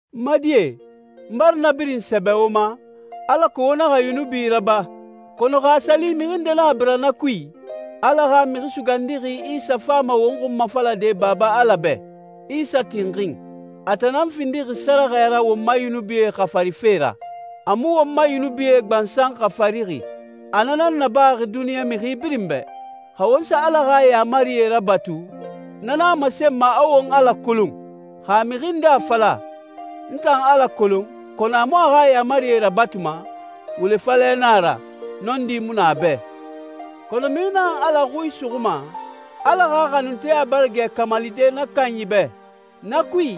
N ma die, n bara na birin sɛbɛ wo ma, alako wo naxa yunubi raba, kɔnɔ xa a sa li mixi nde naxa bira na kui, Ala xa Mixi Sugandixi Isa fama won xunmafalade Baba Ala bɛ. Isa tinxin. A tan nan findixi sɛrɛxɛ ra won ma yunubie xafarife ra. A mu won ma yunubie gbansan xafarixi, a na nan nabaxi duniɲa mixi birin bɛ. Xa won sa Ala xa yaamarie rabatu, na nan a masenma a won Ala kolon. Xa mixi nde a fala, «N tan Ala kolon», kɔnɔ a mu a xa yaamarie rabatuma, wule falɛ nan a ra, nɔndi mu na a bɛ. Kɔnɔ mixi naxan Ala xui suxuma, Ala xa xanunteya bara gɛ kamalide na kanyi bɛ. Na kui,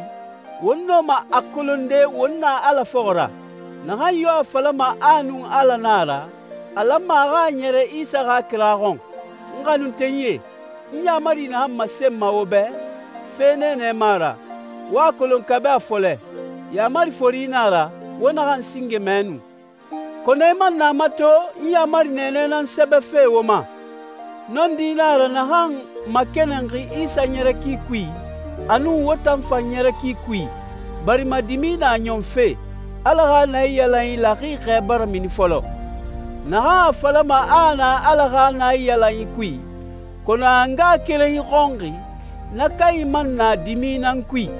won nɔma a kolonde won na Ala fɔxɔ ra. Naxan yo a falama a nun Ala nan a ra, a lanma a xa a ɲɛrɛ Isa xa kira xɔn. N xanuntenyie, n yaamari naxan masenma wo bɛ, fe nɛɛnɛ mu a ra. Wo a kolon kabi a fɔlɛ. Yaamari fori nan a ra, wo naxan singe mɛ nu. Kɔnɔ i man na mato n yaamari nɛɛnɛ nan sɛbɛfe wo ma. Nɔndi nan a ra naxan makɛnɛnxi Isa ɲɛrɛ ki kui a nun wo tan fan ɲɛrɛ ki kui, barima dimi na ɲɔnfe, Ala xa naiyalanyi laxixɛ bara mini fɔlɔ. Naxan a falama a a na Ala xa naiyalanyi kui, kɔnɔ a a ngaxakerenyi xɔnxi, na kanyi man na dimi nan kui.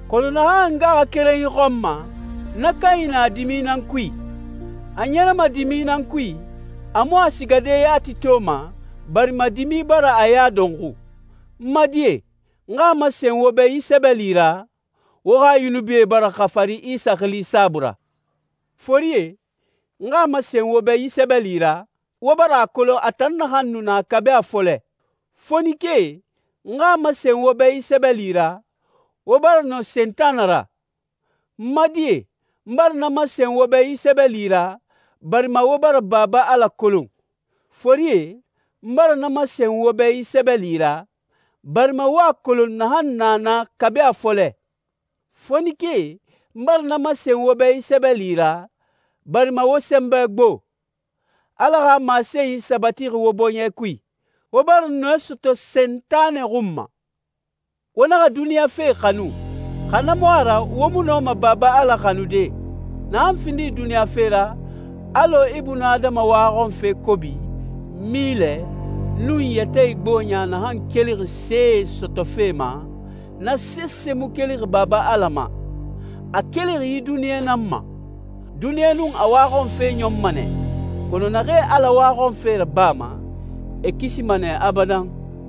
Kɔnɔ naxan a ngaxakerenyi xɔnma, na kanyi na dimi nan kui. A ɲɛrɛma dimi nan kui, a mu a sigade yati toma, barima dimi bara a ya dɔnxu. N ma die, n xa a masen wo bɛ yi sɛbɛli ra: Wo xa yunubie bara xafari Isa xili saabui ra. Forie, n xa a masen wo bɛ yi sɛbɛli ra: Wo bara a kolon a tan naxan nu na kabi a fɔlɛ. Fonikee, n xa a masen wo bɛ yi sɛbɛli ra: Wo bara nɔ Sentanɛ ra. N ma die, n bara na masen wo bɛ yi sɛbɛli ra, barima wo bara Baba Ala kolon. Forie, n bara na masen wo bɛ yi sɛbɛli ra, barima wo a kolon naxan na na kabi a fɔlɛ. Fonikee, n bara na masen wo bɛ yi sɛbɛli ra: barima wo sɛnbɛ gbo. Ala xa masenyi sabatixi wo bɔɲɛ kui. Wo bara nɔɛ sɔtɔ Sentanɛ xun ma. Wo naxa duniɲa fe xanu, xa na mu a ra wo mu nɔma Baba Ala xanude. Naxan findixi duniɲa fe ra, alɔ ibunadama waxɔnfe kobi, milɛ, nun yɛtɛ igboɲa naxan kelixi see sɔtɔfe ma, na sese mu kelixi Baba Ala ma. A kelixi yi duniɲa nan ma. Duniɲa nun a waxɔnfe ɲɔnma nɛ, kɔnɔ naxee Ala waxɔnfe rabama, e kisima nɛ abadan.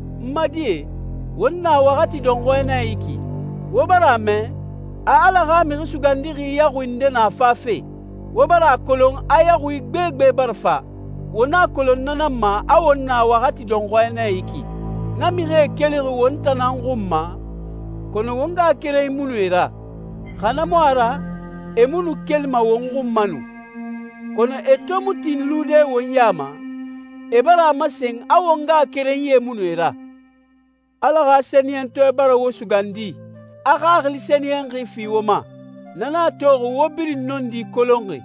N ma die, won na waxati dɔnxɔɛ nɛ yi ki. Wo bara a mɛ, a Ala xa Mixi Sugandixi yaxui nde na fafe. Wo bara a kolon a yaxui gbegbe bara fa. Won a kolon na nan ma a won na waxati dɔnxɔɛ nɛ yi ki. Na mixie kelixi won tan nan xun ma, kɔnɔ won ngaxakerenyi mu nu e ra, xa na mu a ra e mu nu kelima won xun ma nu. Kɔnɔ e to mu tin lude won ya ma, e bara a masen a won ngaxakerenyie mu nu e ra. Ala xa Sɛniyɛntɔɛ bara wo sugandi, a Xaxili Sɛniyɛnxi fi wo ma. Na nan a toxi wo birin nɔndi kolonxi.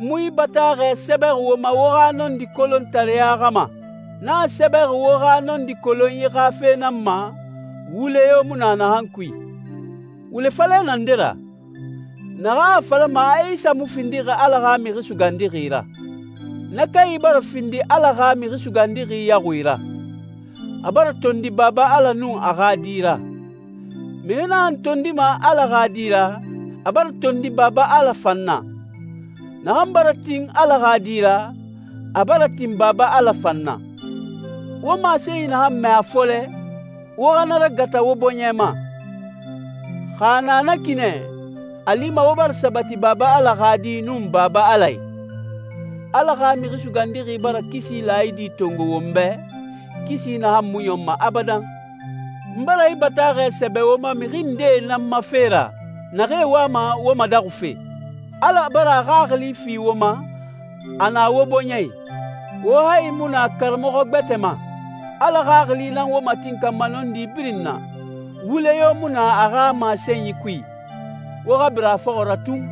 N mu yi bataaxɛ sɛbɛxi wo ma wo xa nɔndi kolontareya xa ma. N a sɛbɛxi wo xa nɔndi kolonyi xa fe nan ma, wule yo mu na naxan kui. Wule falɛ na nde ra? Naxan a falama a Isa mu findixi Ala xa Mixi Sugandixi ra. Na kanyi bara findi Ala xa Mixi Sugandixi yaxui ra. A bara tondi Baba Ala nun a xa Di ra. Mixi naxan tondima Ala xa Di ra, a bara tondi Baba Ala fan na. Naxan bara tin Ala xa Di ra, a bara tin Baba Ala fan na. Wo masenyi naxan mɛ a fɔlɛ, wo xa na ragata wo bɔɲɛ ma. Xa a na na ki nɛ, a lima wo bara sabati Baba Ala xa Di nun Baba Ala i. Ala xa Mixi Sugandixi bara kisi laayidi tongo won bɛ, kisi naxan mu ɲɔnma abadan. N bara yi bataaxɛ sɛbɛ wo ma mixi ndee nan ma fe ra naxee wama wo madaxufe. Ala bara a Xaxili fi wo ma, a na wo bɔɲɛ i. Wo hayi mu na karamɔxɔ gbɛtɛ ma. Ala Xaxili nan wo matinkanma nɔndi birin na. Wule yo mu na a xa masenyi kui. Wo xa bira a fɔxɔ ra tun.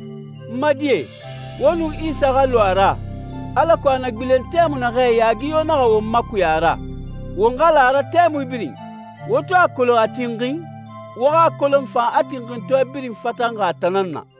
N ma die, wo nun Isa xa lu a ra, alako a na gbilen tɛmui naxɛ yaagi yo naxa won makuya a ra. Won xa la a ra tɛmui birin. Wo to a kolon a tinxin, wo xa a kolon fan a tinxintɔɛ birin fatanxi a tan nan na.